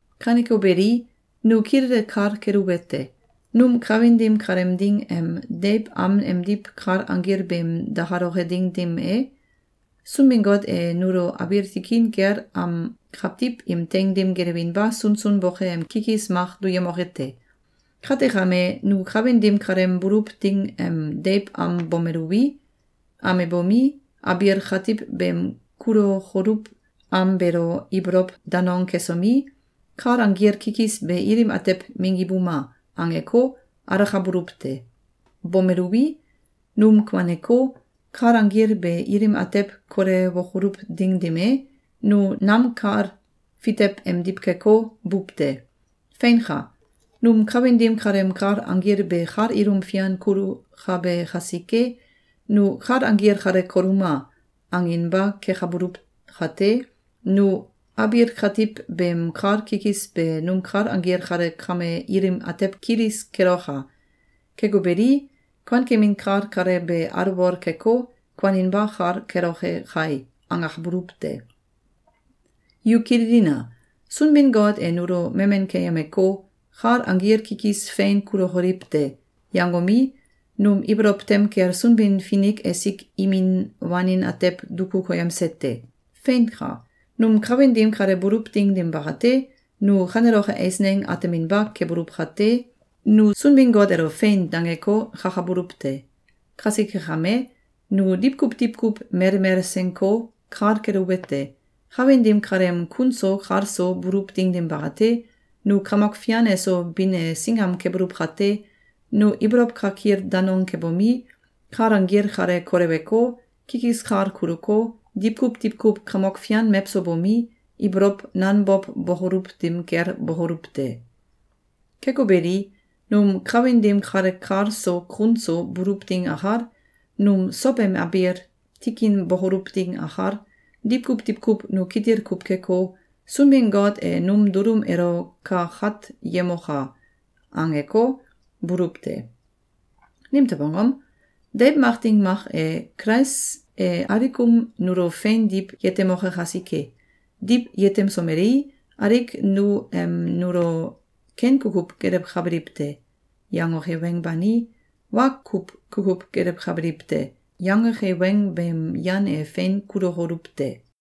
Kaneko beli, nu kilele kal keluwete: Num kawin dim kaleem ding em deiw am emdiw kal anggil beem dakaloke ding dim e, Sunbin-Got e nulo abiil tikin kel am kawtiw im teing dim gelewinba sunsun boke am kikis mak duyemoke te. Kate kame, nu kawin dim kaleem buluw ding em deiw am bomeluwi, amebomi, abiil katiw beem kulokoluw am beelo ibolow danong kesomi, “Kal anggil kikis be ilim atew minggibuma!”, angeko, alakabululw te. Bomeluwi, num kuaneko, kal anggil be ilim atew kolewokoluw ding dim e, nu nam kal fitew emdiw keko, buw te. Feinka! Num kawin dim kaleem kal anggil be kal ilum fian kulukabe kasike, nu “Kal anggil kale koluma!”, anginba kekabuluw kate, nu “Abiil katiw beem kal kikis be num kal anggil kale kame ilim atew kilis keloka! Keko beli, kuankemin kal kale be alwol keko, kuaninba kal keloke kai!”, angakabuluw te. Yu kililina! Sunbin-Got e nulo memen keyemeko, “Kal anggil kikis fein kulokoliw te!”, yangomi, num ibolow tem kel Sunbin-Finik esik imin wanin atew duku koyemse te. Feinka! Num kawin dim kale buluw ding dim bakate, nu kaneloke eisneng ateminba kebuluw kate, nu Sunbin-Got elo “Fein!”, dangeko, kakabuluw te. Kasike kame, nu diwkuw diwkuw melmel senko, kal keluwete: Kawin dim kaleem kun so kal so buluw ding dim bakate, nu Kamok Fian eso bin e singam kebuluw kate, nu ibolow kakil danong kebomi, kal anggil kale koleweko, kikis kal kuluko, diwkuw diwkuw Kamok Fian mewso bomi, ibolow nanbow bokoluw dim kel bokoluw te. Keko beli, num kawin dim kale kal so kun so buluw ding akal, num sow em abiil tikin bokoluw ding akal, diwkuw diwkuw nu kitil kuw keko, “Sunbin-Got e num dulum elo kakatyemoka!”, angeko, buluw te. Nimtew angom? Deiw mak ding mak e, Kulais e alikum nulo fein diw yetemoke kasike. Diw yetemsomelei, alik nu em nulo “Ken kukuw gelewkabiliw te!”, yangoke weng bani, “Wa kuw kukuw gelewkabiliw te!”, yangoke weng beem yan e fein kulukoluw te.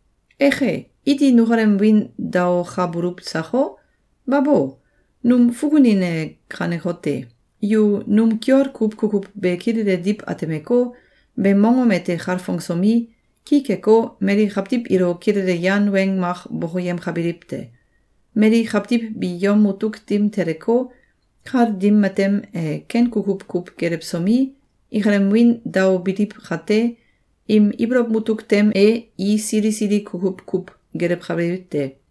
Eke! Iti nukalem wiin daokabuluw sako? Babo! Num fukunin e kanekote: Yu num kiol kuw kukuw be kilele diw atemeko, beem mongom ete kalfongsomi, ki keko, mali kawtiw ilo kilele yan weng mak bokoyemkabiliw te. Mali kawtiw bi yom mutuk dim teleko, kal dim matem e ken kukuw kuw gelewsomi, ikalem wiin daobiliw kate, im ibolow mutuk tem e i sili sili kukuw kuw gelewkabiliw te.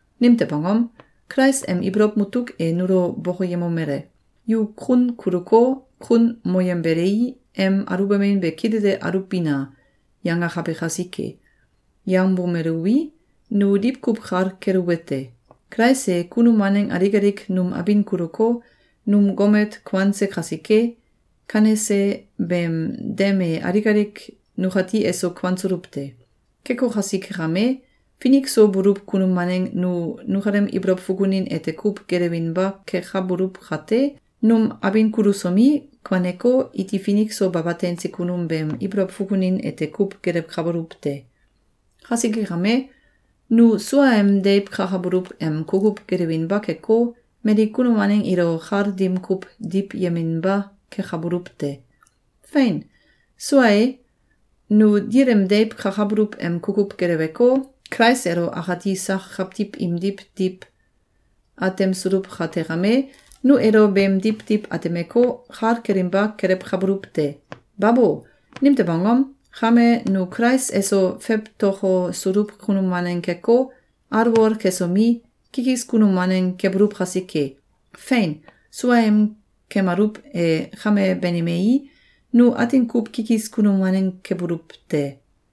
Nimtew angom? Kulais em ibolow mutuk e nulo bokoyemomele: “Yu kun kuluko, kun moyembelei, em aluwbamin be kilele aluwbina!”, yangakabe kasike. Yangbomeluwi, nu diwkuw kal keluwete: Kulais e kunum waneng alik alik num abin kuluko, num gomet kuanse kasike, kanese beem dem e alik alik nukati eso kuansuluw te. Keko kasike kame, finik so buluw kunum waneng nu nukalem ibolow fukunin ete kuw gelewinba kekabuluw kate, num abin kulusomi, kuaneko, iti finik so baba teinse kunum beem ibolow fukunin ete kuw gelewkabuluw te. Kasike kame, nu suaem deiw kakabuluw em kukuw gelewinba keko, mali kunum waneng ilo kal dim kuw diwyeminba kekabuluw te. Fein! Sua e, nu dil em deiw kakabuluw em kukuw geleweko, Kulais elo akati sak kawtiw imdiw diw atemsuluw kate kame, nu elo beemdiw diw atemeko, kal kelinba kelewkabuluw te. Babo! Nimtew angom? Kame, nu Kulais eso fewtokosuluw kunum waneng keko, alwol kesomi, kikis kunum waneng kebuluw kasike. Fein! Suaem kemaluw e kame banimei, nu atin kuw kikis kunum waneng kebuluw te.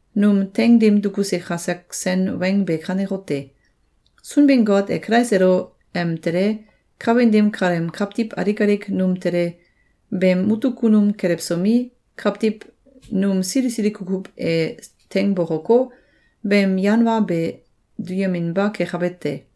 Num teing dim dukuse kasak sen weng be kanekote: Sunbin-Got e Kulais elo em tele, kawin dim kaleem kawtiw alik alik num tele, beem mutuk kunum kelewsomi, kawtiw num sili sili kukuw e teing bokoko, beem yan wa be duyeminba kekabe te.